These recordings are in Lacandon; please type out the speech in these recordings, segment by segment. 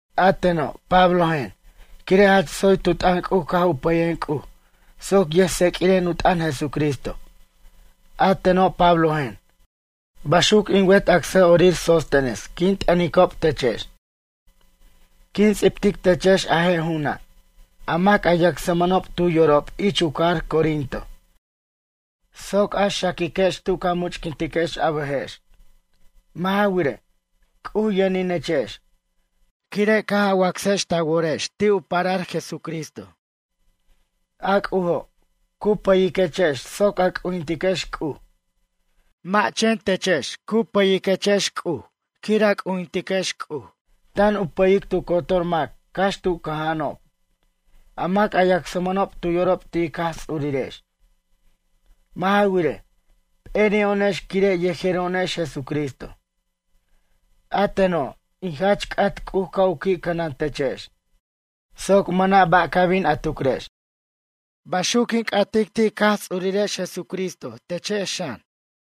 A teno', Pablojen, quire' jach tsoy tu t'ʌn C'uj caj u pʌyen C'uj soc yʌjtseq'uiren u t'ʌn Jesucristo. A teno', Pablojen, baxuc in wet acsa'orir Sóstenes quin t'ʌnicob techex. Quin ts'ibtic techex a je' ju'una', a mac a yacsmʌnob tu yorob ich u cajar Corinto, soc a xaquiquex tu ca much'quintiquex a bʌjex. Mʌ' ja wirej, C'uj yʌninechex, quire' caj a wacsex ta worex ti' u parar, Jesucristo. A C'ujo', cu pʌyiquechex soc a c'ujintiquex C'uj. Mʌ' chen techex cu pʌya'r ten C'uj quir a c'ujintiquex C'uj, tan u pʌyic tu cotor mac cax tu cʌja'anob, a mac a yacsmʌnob tu yorob ti' ic Jaj Ts'urirex. Mʌ' ja wirej, p'eri'o'onex quire' yejero'onex Jesucristo. A teno', in jach c'at C'uj ca' u qui' cʌnantechex, soc mʌna' ba' ca bin a tucrex. Baxuc quin c'atic ti' ic Jaj Ts'urirex Jesucristo techex xan.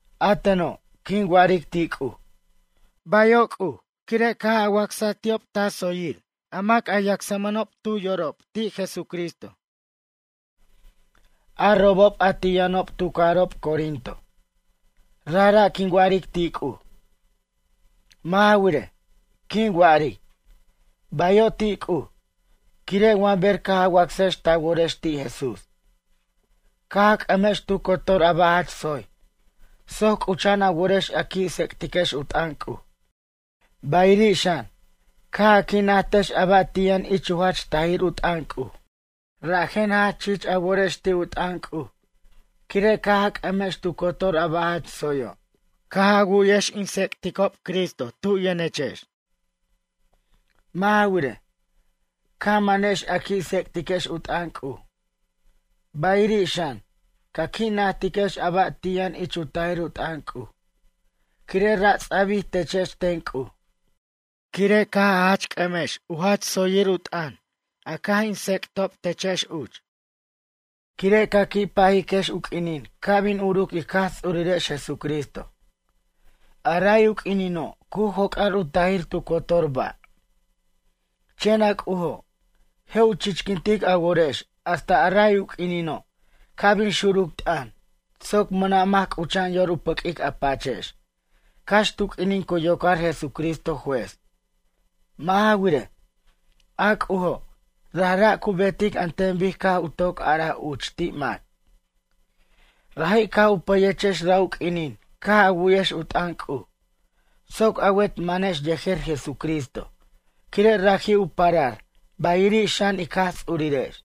A teno', quin wa'aric ti' C'uj: “Bayo', C'uj, quire' caj a wacsaj ti'ob ta tsoyirob, a mac a yacsmʌnob tu yorob ti' Jesucristo, a robob a ti' yʌnob tu cajarob Corinto.” Rajra' quin wa'aric ti' C'uj. Mʌ' ja wirej, quin wa'aric: “Bayo' ti' C'uj”, quire' wa ber caj a wacsex ta worex ti' Jesús, caj a c'ʌmex tu cotor a ba' jach tsoy soc c'ucha'an a worex a qui' tsec'tiquex u t'ʌn C'uj. Bayiri' xan, caj a qui' najtex a ba' ti' yʌn ich u jach tajir u t'ʌn C'uj. Rajen jach chich a worex ti' u t'ʌn C'uj, quire' caj a c'ʌmex tu cotor a ba' jach tsoyo', caj a wu'yex in tsec'tob Cristo tu' yʌnechex. Mʌ' ja wirej, ca manex a qui' tsec'tiquex u t'ʌn C'uj. Bayiri' xan, ca qui' najtiquex a ba' ti' yʌn ich u tajir u t'ʌn C'uj, quire' ra' ts'abij techex ten C'uj. Quire' caj a jach c'ʌmex u jach tsoyir u t'ʌn, a caj in tsec'tob techex uch. Quire' ca qui' pajiquex u q'uinin ca' bin uruc ic Jaj Ts'urirex Jesucristo. A ray u q'uinino', cu joc'ar u tajir tu cotor ba'. Chen a C'ujo', je' u chichquintic a worex hasta a ray u q'uinino', ca' bin xuruc t'ʌn soc mʌna' mac c'ucha'an yor u pʌq'uic a pachex, cax tu q'uinin cu yocar Jesucristo juez. Mʌ' ja wirej, a C'ujo', rajra' cu betic an ten bic caj u toc araj uch ti' mac. Raji' caj u pʌyechex ra' u q'uinin caj a wu'yex u t'ʌn C'uj, soc a wet manex yejer Jesucristo, quire' raji' u parar, bayiri' xan ic Jaj Ts'urirex.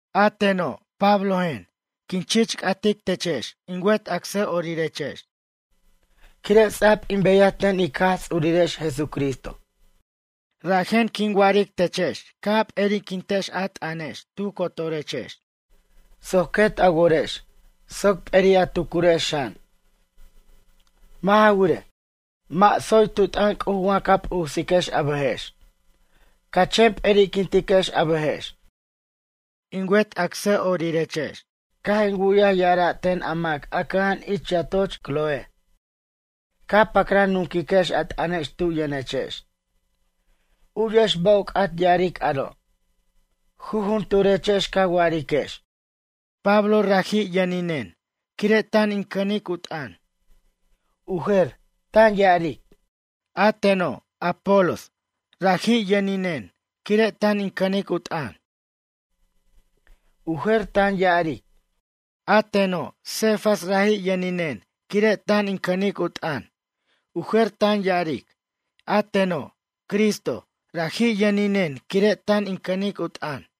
A teno', Pablojen, quin chich c'atic techex in wet acsa'orirex, quire' ts'a'b in beyaj ten ic Jaj Ts'urirex Jesucristo. Rajen quin wa'aric techex ca' a p'eriquintex a t'ʌnex tu cotorechex, soc quet a worex, soc p'eri' a tucurex xan. Mʌ' ja wirej, mʌ' tsoy tu t'ʌn C'uj wa ca p'usiquex a bʌjex, ca' a chen p'eri'quintex a bʌjex. In wet acsa'orirex caj in wu'yaj ya'ara' ten a mac a cʌja'an ich u yatoch Cloé, ca pacran nunquiquex a t'ʌnex tu' yʌnechex. U'yex ba' u c'at ya'aric aro'. Jujunturechex ca wa'ariquex: “Pablo, raji' yʌninen quire' tan in cʌnic u t'ʌn.” U jer, tan ya'aric: “A teno', Apolos, raji' yʌninen, quire' tan in cʌnic u t'ʌn.” U jer, tan ya'aric: “A teno', Cefas raji' yʌninen quire' tan in cʌnic u t'ʌn.” U jer tan ya'aric: “A teno', Cristo, raji' yʌninen quire' tan in cʌnic u t'ʌn.”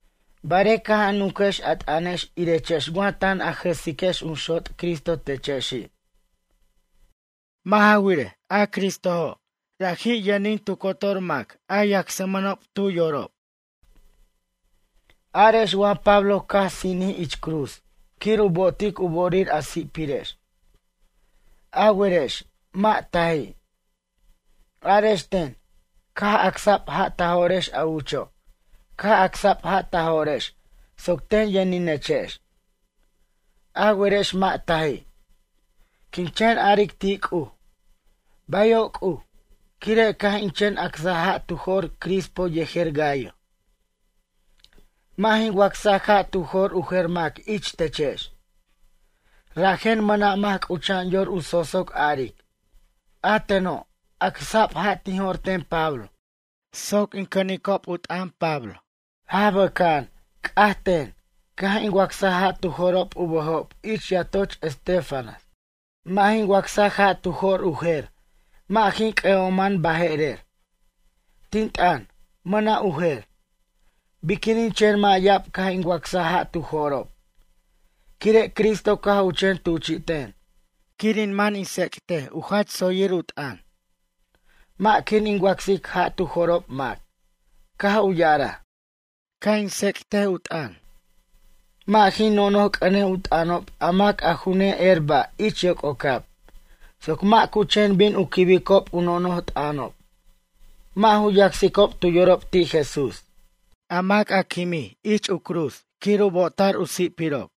Barej caj a nunquex a t'ʌnex irechex wa tan a jʌsiquex jun xot' Cristo techexi'. Mʌ' ja wirej, a Cristojo', raji' yʌnin tu cotor mac a yacsmʌnob tu yorob. Arex wa Pablo caj sinij ich u cruz quir u bo'otic u bo'orir a si'pirex? A werex, mʌ' taji'. Arex ten, caj acsa'b ja' ta jo'rex a ucho', caj acsa'b ja' ta jo'rex soc ten yʌninechex? A werex mʌ' taji'. Quin chen a'aric ti' C'uj: “Bayo' C'uj quire' caj in chen acsaj ja' tu jo'r Crispo yejer Gayo.” Mʌ' jin wacsaj ja' tu jo'r u jer mac ich techex. Rajen, mʌna' mac c'ucha'an yor u sosoc aric: “A teno', acsa'b ja' tin jo'r ten Pablo soc in cʌnicob u t'ʌn Pablo.” Jaj bʌca'an, c'aj ten, caj in wacsaj ja' tu jo'rob u bʌjob ich yatoch Estéfanas. Mʌ' jin wacsaj ja' tu jo'r u jer, mʌ' jin c'ʌ'oman baje'rer. Tin t'ʌn, mʌna' u jer. Biquinin chen mʌ' ya'ab caj in wacsaj ja' tu jo'rob, quire' Cristo caj u chen tuchi'ten quir in man in tsec't u jach tsoyir u t'ʌn, mʌ' quir in wacsic ja' tu jo'rob mac, caj u ya'araj. Ca' in tsec't u t'ʌn, mʌ' jin nonoj c'ʌnej u t'ʌnob a mac a ju ne'er ba' ich yoc'ocab, soc mac cu chen bin u quibicob u nonoj t'ʌnob, mʌ' ju yacsicob tu yorob ti' Jesús, a mac a quimij ich u cruz quir u bo'ota'r u si'pirob.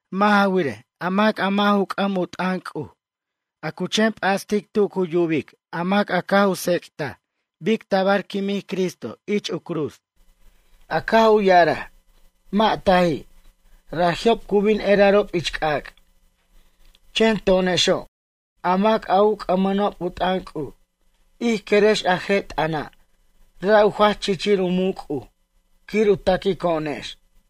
Mʌ' ja wirej, a mac a mʌ' ju c'ʌm u t'ʌn C'uj, a cu chen p'astic tu cu yubic a mac a caj u tsec'taj bic tabar quimij Cristo ich u cruz, a caj u ya'araj, mʌ' taji', raji'ob cu bin erarob ich c'ac'. Chen to'onexo', a mac a u c'ʌmʌnob u t'ʌn C'uj, ij querex a je' t'ʌna', ra' u jach chichir u muc' C'uj quir u taquico'onex.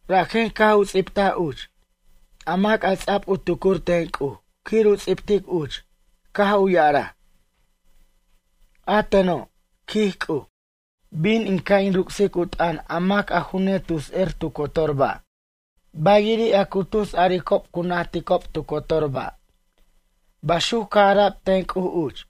Rajen caj u ts'ibtaj uch, a mac a ts'ab u tucur ten C'uj quir u ts'ibtic uch, caj u ya'araj: A teno', quij C'uj, bin in ca' in ruc'sic u t'ʌn a mac a ju netus er tu cotor ba'. Bayiri' a cu tus aricob cu najticob tu cotor ba'. Baxuc caj ara'b ten C'uj uch.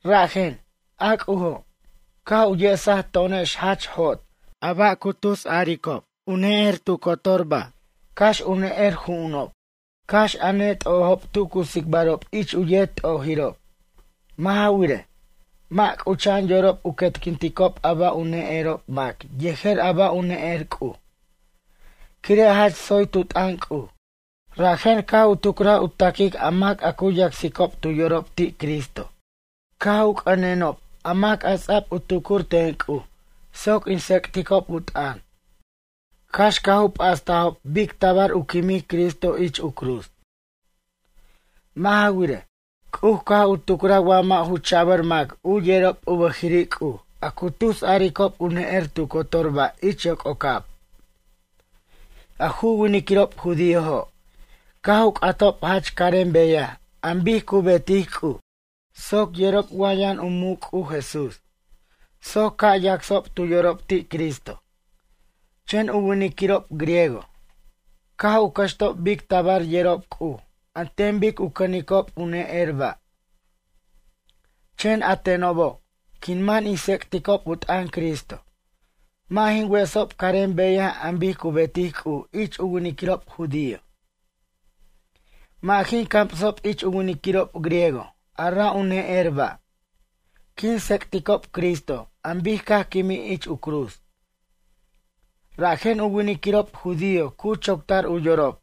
Rajen, a C'ujo', caj u yesaj to'onex jach jot, a ba' a cu tus aricob u ne'er tu cotor ba', cax u ne'er ju'unob, cax a net'ojob tu cu tsicbarob ich u yet t'ojirob. Mʌ' ja wirej, mʌ' c'ucha'an yorob u quetquinticob a ba' u ne'erob mac yejer a ba' u ne'er C'uj. Quire' jach tsoy tu t'ʌn C'uj, rajen caj u tucraj u ta'quic a mac a cu yacsicob tu yorob ti' Cristo, caj u c'ʌnenob a mac a ts'a'b u tucur ten C'uj soc in tsec'ticob u t'ʌn cax caj u p'astajob bic tabar u quimij Cristo ich u cruz. Mʌ' ja wirej, C'uj caj u tucraj wa mʌ' ju cha'bar mac u yerob u bʌjiri' C'uj a cu tus aricob u ne'er tu cotor ba' ich yoc'ocab. A ju winiquirob judíojo', caj u c'atob jach carem beyaj an bic cu betic C'uj, soc yerob wa yʌn u muc' C'uj Jesús, soc ca' yacsob tu yorob ti' Cristo. Chen u winiquirob griego, caj u cʌxtob bic tabar yerob C'uj an ten bic u cʌnicob u ne'er ba'. Chen a tenobo', quin man in tsec'ticob u t'ʌn Cristo, mʌ' jin wesob carem beyaj an bic cu betic C'uj ich u winiquirob judío. Mʌ' jin camsob ich u winiquirob griego a ra' u ne'er ba'. Quin tsec'ticob Cristo an bic caj quimij ich u cruz. Rajen u winiquirob judío cu choctar u yorob,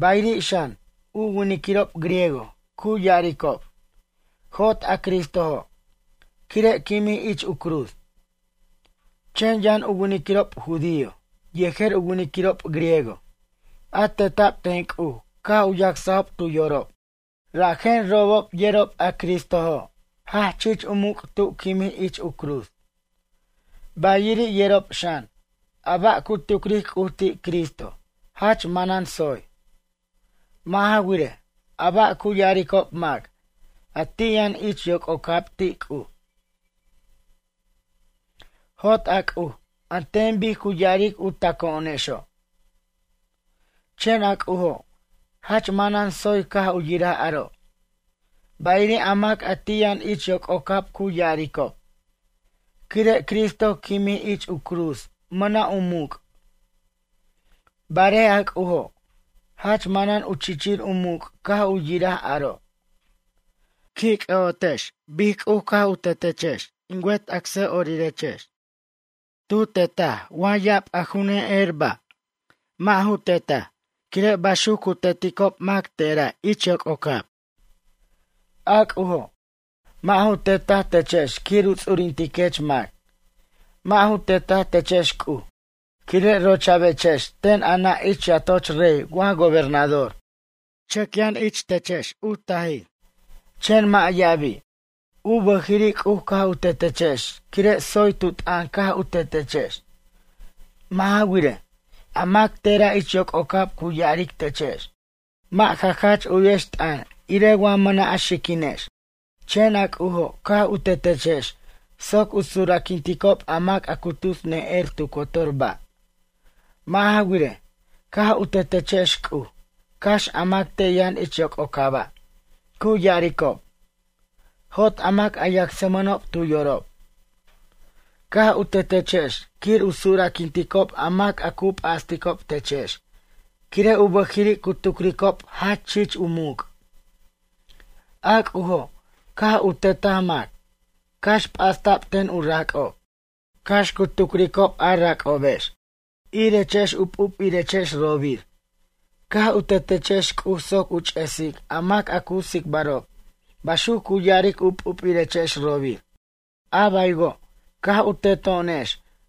bayiri' xan, u winiquirob griego cu ya'aricob: “Jot a Cristojo'”, quire' quimij ich u cruz. Chen yʌn u winiquirob judío, yejer u winiquirob griego, a teta'b ten C'uj caj u yacsajob tu yorob. Rajen robob yerob a Cristojo' jach chich u muc' tu quimij ich u cruz. Bayiri' yerob xan, a ba' cu tucric C'uj ti' Cristo jach manan tsoy. Mʌ' ja wirej, a ba' cu ya'aricob mac, a ti' yʌn ich yoc'ocab, ti' C'uj: “Jot a C'uj, an ten bic cu ya'aric u taco'onexo'.” Chen a C'ujo', jach manan tsoy caj u yiraj aro'. Bayiri' a mac a ti' yʌn ich yoc'ocab cu ya'aricob: “Quire' Cristo quimij ich u cruz mʌna' u muc'.” Barej a C'ujo', jach manan u chichir u muc' caj u yiraj aro'. Qui' c'ʌ'otex bic C'uj caj u tetechex in wet asa'orirex. Tu tetaj wa ya'ab a ju ne'er ba'? Mʌ' ju tetaj, quire' baxuc cu teticob mac tera' ich yoc'ocab. A C'ujo', mʌ' ju tetaj techex quir u ts'urintiquex mac. Mʌ' ju tetaj techex C'uj, quire' rocha'bechex ten a nʌ' ich yatoch rey wa gobernador. Chʌc yʌn ich techex u tajir, chen mʌ' ya'abi'. U bʌjiri' C'uj caj u tetechex quire' tsoy tu t'ʌn caj u tetechex. Mʌ' ja wirej, a mac tera' ich yoc'ocab cu ya'aric techex: “Mʌ' ja jach u'yex t'ʌn irej wa mʌna' a xiquinex.” Chen a C'ujo' caj u tetechex soc u sura'quinticob a mac a cu tus ne'er tu cotor ba'. Mʌ' ja wirej, caj u tetechex C'uj, cax a mac te' yʌn ich yoc'ocaba', cu ya'aricob: “Jot a mac a yacsmʌnob tu yorob.” Caj u tetechex quir u sura'quinticob a mac a cu p'asticob techex, quire' u bʌjiri' cu tucricob jach chich u muc'. A C'ujo', caj u tetaj mac, cax p'asta'b ten u rac'ob. Cax cu tucricob a rac'obex: “Irechex u p'up'irechex robir”, caj u tetechex C'uj soc u ch'esic a mac a cu tsicbarob baxuc cu ya'aric u p'up'irechex robir. A baywo', caj u teto'onex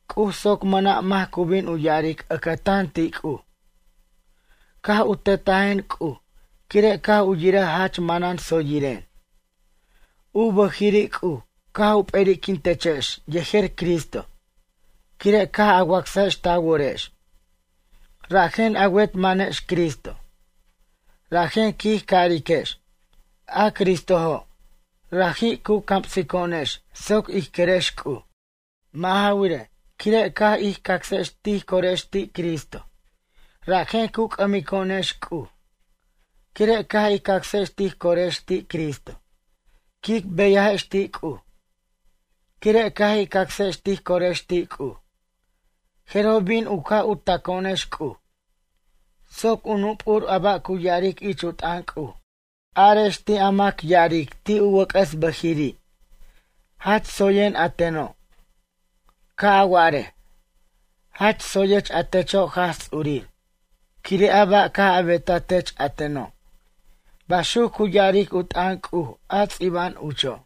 C'uj soc mʌna' mac cu bin ya'aric ʌcʌtan ti' C'uj: “Caj u tetajen C'uj quire' caj u yiraj jach manan tsoyiren.” U bʌjiri' C'uj, caj u p'eri'quintechex yejer Cristo, quire' caj a wacsajex ta worex. Rajen a wet manex Cristo, rajen quij cariquex: “A Cristojo', raji' cu camsico'onex soc ij querex C'uj.” Mʌ' ja wirej, quire' caj ij cacsex tij corex ti' Cristo, rajen cu c'ʌmico'onex C'uj. Quire' caj ij cacsex tij corex ti' Cristo, quic beyajex ti' C'uj. Quire' caj ij cacsex tij corex ti' C'uj, jeroj bin u ca' u taco'onex C'uj. Soc u nup'ur a ba' cu ya'aric ich u t'ʌn C'uj, arex ti' a mac ya'aric ti' u wʌc'ʌs bajiri': “Jach tsoyen a teno'.” Ca' a wa'arej: “Jach tsoyech a techo' Jaj Ts'urir, quire' a ba' caj a betaj tech a teno'.” Baxuc cu ya'aric u t'ʌn C'uj a ts'iba'an ucho'.